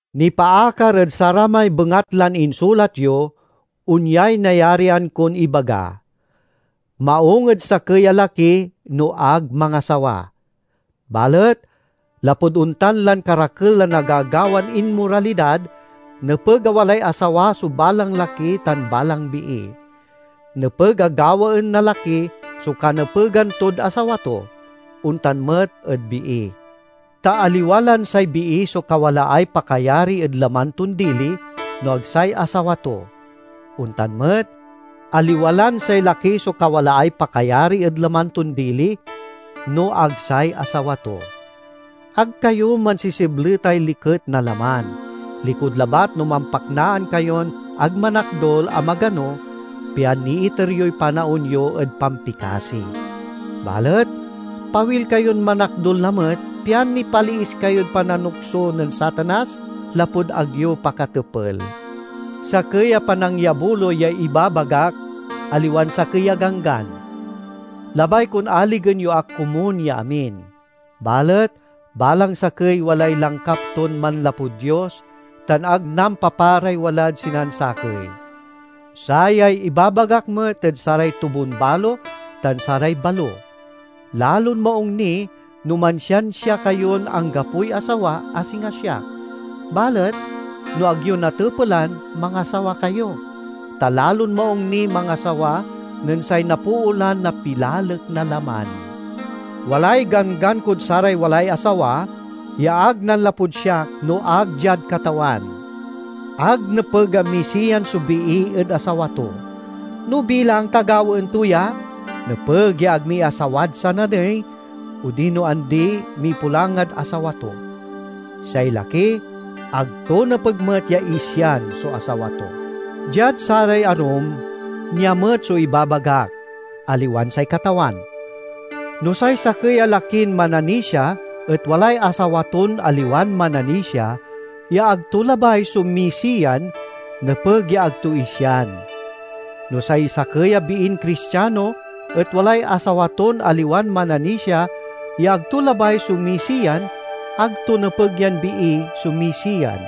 Nipaakar ed saramay bengatlan insulat yo, onyay nayarian kon ibaga: maung ed sakey a laki no ag mangasawa. Balet lapud ontan lan karakel a nagagawan inmoralidad, nepeg a walay asawa so balang laki tan balang bii. Nepeg a gawaen na laki so kanepegan tod asawa to; ontan met ed bii. Ta aliwa lan say bii so kawalaay pakayari ed laman ton dili, no ag say asawa to; ontan met, aliwa lan say laki so kawalaay pakayari ed laman ton dili, no ag say asawa to. Ag kayo mansisibletay liket na laman, likud labat no mampaknaan kayon ag manakdul a magano, pian niiter yoy panaon yo ed pampikasi. Balet pawil kayon manakdul lamet, pian nipaliis kayod pananukso nen Satanas, lapud ag yo pakatepel. Sakey a panangyabuloy yay ibabagak, aliwan sakey a ganggan. Labay kon aligen yo ak komun ya amin. Balet balang sakey walay langkap ton manlapud Dios, tan ag nampaparay walad sinansakey. Sayay ibabagak met ed saray tubonbalo tan saray balo: lalon maung ni no mansiansia kayon anggapoy asawa, a singa siak. Balet no ag yo natepelan, mangasawa kayo; ta lalon maung niy mangasawa nen say napoolan na pilalek na laman. Walay ganggan kod saray walay asawa, ya ag nanlapud siak no ag diad Katawan: ag nepeg a misiyan so bii ed asawa to. No bilang ta gawaen to ya, nepeg ya ag miasawad sananey, odino andi mipulangad asawa to. Say laki ag to nepeg met ya isian so asawa to. Diad saray arum, nia met so ibabagak, aliwan say Katawan: no say sakey a lakin mananisia et walay asawa ton aliwan mananisia ya ag to labay so misiyan, nepeg ya ag to isian. No say sakey a biin Cristiano et walay asawa ton aliwan mananisia ya ag to labay so misiyan, ag to nepeg yan bii so misiyan.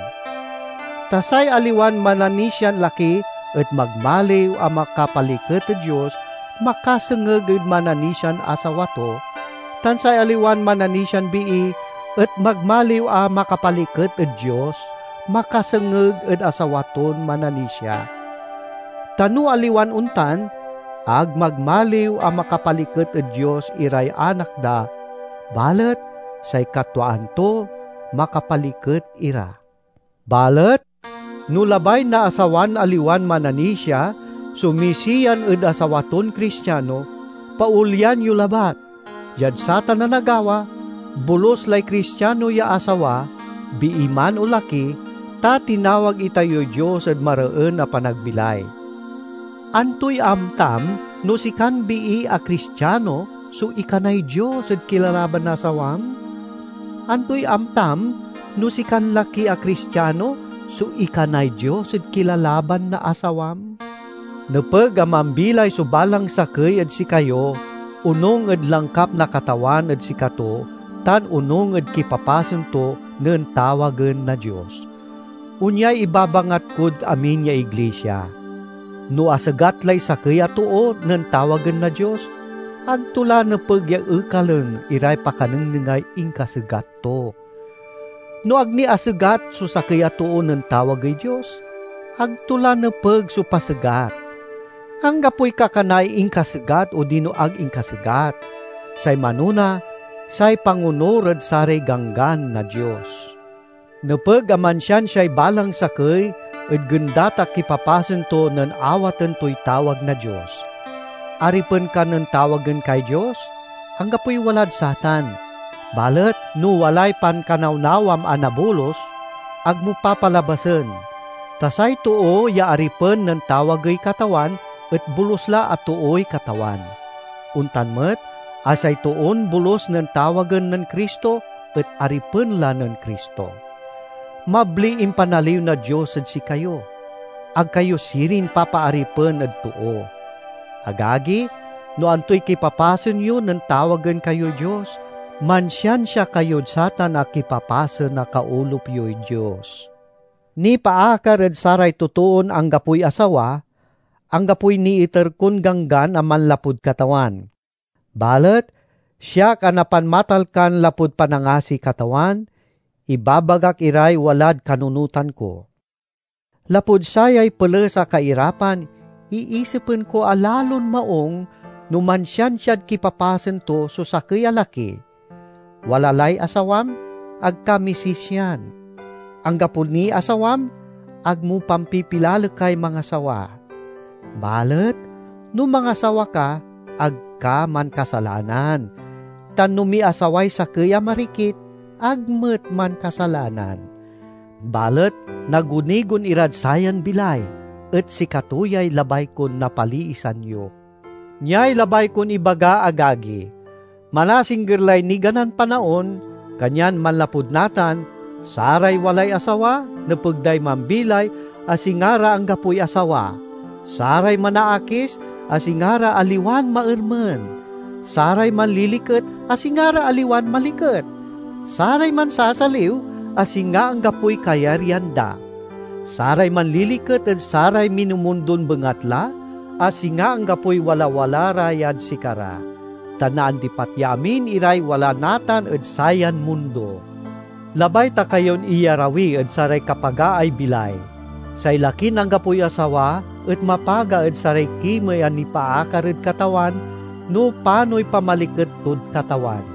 Ta say aliwan mananisian laki et magmaliw a makapaliket ed Dios makasengeg ed mananisian asawa to, tan say aliwan mananisian bii et magmaliw a makapaliket ed Dios, makasengeg ed asawa ton mananisia. Ta no aliwan ontan, ag magmaliw a makapaliket ed Dios iray anak da, balet say katwaan to, makapaliket ira. Balet no labay na asawan aliwan mananisia so misiyan ed asawa ton Cristiano, paolyan yo labat. Diad satan a nagawa, bolus lay Cristiano ya asawa, bii man o laki, ta tinawag itayoy Dios ed mareen a panagbilay. Antoy amtam, no sikan bii a Cristiano so ikanay Dios ed kilalaban na asawam? Antoy amtam, no sikan laki a Cristiano so ikanay Dios ed kilalaban na asawam? Nepeg a mambilay so balang sakey ed sikayo onung ed langkap na Katawan ed sikato tan onung ed kipapasen to nen tawagen na Dios. Onyay ibabangat kod amin ya iglisia. No asegat lay sakey a too nen tawagen na Dios, ag to la nepeg ya ekalen iray pakanengnengay inkasegat to. No ag ni asegat so sakey a too nen tawagey Dios, ag to la nepeg so pasegat. Anggapoy kakanaay inkasegat odino ag inkasegat. Say manona, say pangonur ed saray ganggan na Dios. Nepeg a mansiansiay balang sakey ed gendat a kipapasen to nen awaten toy tawag na Dios. Aripen ka nen tawagen kay Dios? Anggapoy walad satan, balet no walay pankanawnawam a nabolus, ag mo papalabasen. Ta say too ya aripen nen tawagey Katawan et bolus la a tooy Katawan. Ontan met a say toon bolus nen tawagen nen Cristo et aripen la nen Cristo. Mabliy impanaliw na Dios ed sikayo; ag kayo sirin papaaripen ed too. Agagi, no antoy kipapasen yo nen tawagen kayoy Dios, mansiansia kayod satan a kipapasen a kaolup yoy Dios. Nipaakar ed saray totoon anggapoy asawa, anggapoy niiter kon ganggan a manlapud Katawan. Balet siak a napanmatalkan lapud panangasiy Katawan, ibabagak iray walad kanunotan ko. Lapud sayay peles a kairapan, iisipen ko a lalon maung no mansiansiad kipapasen to so sakey a laki. Wala lay asawam? Ag ka misisian. Anggapo niy asawam? Ag mo pampipilalekay mangasawa. Balet no mangasawa ka, ag ka mankasalanan, tan no miasaway sakey a marikit ag met mankasalanan. Balet nagunigon irad sayan bilay, et sikato yay labay kon napaliisan yo. Niay labay kon ibaga, agagi: manasingger lay niganan panaon, kanyan manlapud natan, saray walay asawa nepeg day mambilay, a singa ra anggapoy asawa; saray manaakis, a singa ra aliwan maermen; saray manliliket, a singa ra aliwan maliket; saray mansasaliw, a singa anggapoy kayaryan da; saray manliliket ed saray minumundon bengatla, a singa anggapoy walawala ra yad sikara. Ta naandipat ya amin iray wala natan ed sayan mundo. Labay ta kayon iyarawi ed saray kapagaay bilay. Say lakin anggapoy asawa et mapaga ed saray kimey a nipaakar ed Katawan, no panoy pamaliket tod Katawan.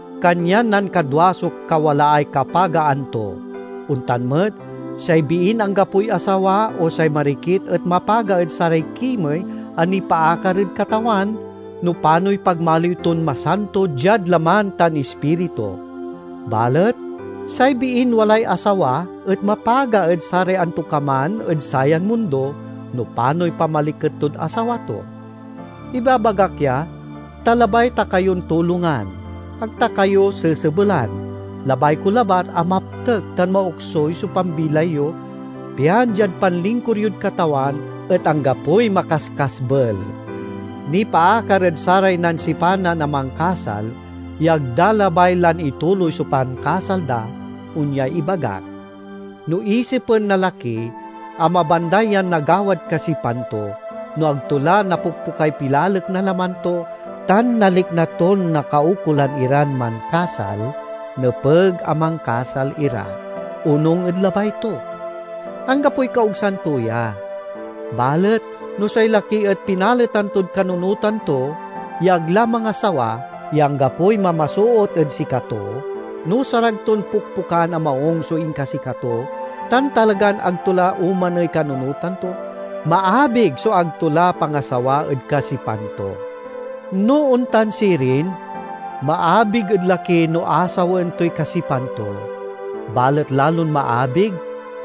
Kanyan nankadwa so kawalaay kapagaan to. Ontan met, say biin anggapoy asawa o say marikit et mapaga ed saray kimey a nipaakar ed Katawan, no panoy pagmaliw ton masanto diad laman tan ispiritu; balet say biin walay asawa et mapaga ed saray antokaman ed sayan mundo, no panoy pamaliket tod asawa to. Ibabagak ya, ta labay ta kayon tulongan. Ag ta kayo sesebelan; labay ko labat a maptek tan maoksuy so pambilay yo, pian diad panlingkur yod Katawan et anggapoy makaskasbel. Nipaakar ed saray nansipanan a mankasal ya ag da labay lan ituloy so pankasal da, onyay ibagak: no isipen na laki a mabanday yan nagawad kasipan to, no ag to la napokpokay pilalek na laman to, tan nalikna ton nakaukolan iran mankasal, nepeg a mankasal ira, onung ed labay to. Anggapoy kaogsan to ya. Balet no say laki et pinaletan tod kanunotan to ya ag la mangasawa, ya anggapoy mamasoot ed sikato, no saray ton pokpokan a maung so inkasikato, tan talagan ag to la omaney kanunotan to, maabig so ag to la pangasawa ed kasipan to. No ontan sirin, maabig ed laki no asawaen toy kasipan to, balet lalon maabig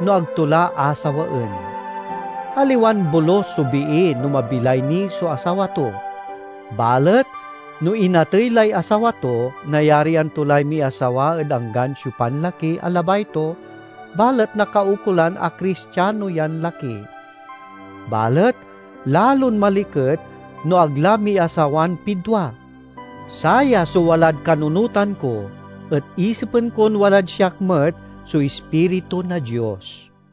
no ag to la asawaen. Aliwan bolus so bii no mabilay ni so asawa to. Balet no inatey lay asawa to, nayarian to lay miasawa ed anggan siopan laki a labay to, balet nakaukolan a Cristiano yan laki. Balet lalon maliket no ag la miasawan pidwa. Saya so walad kanunotan ko, et isipen kon walad siak met so Ispiritu na Dios.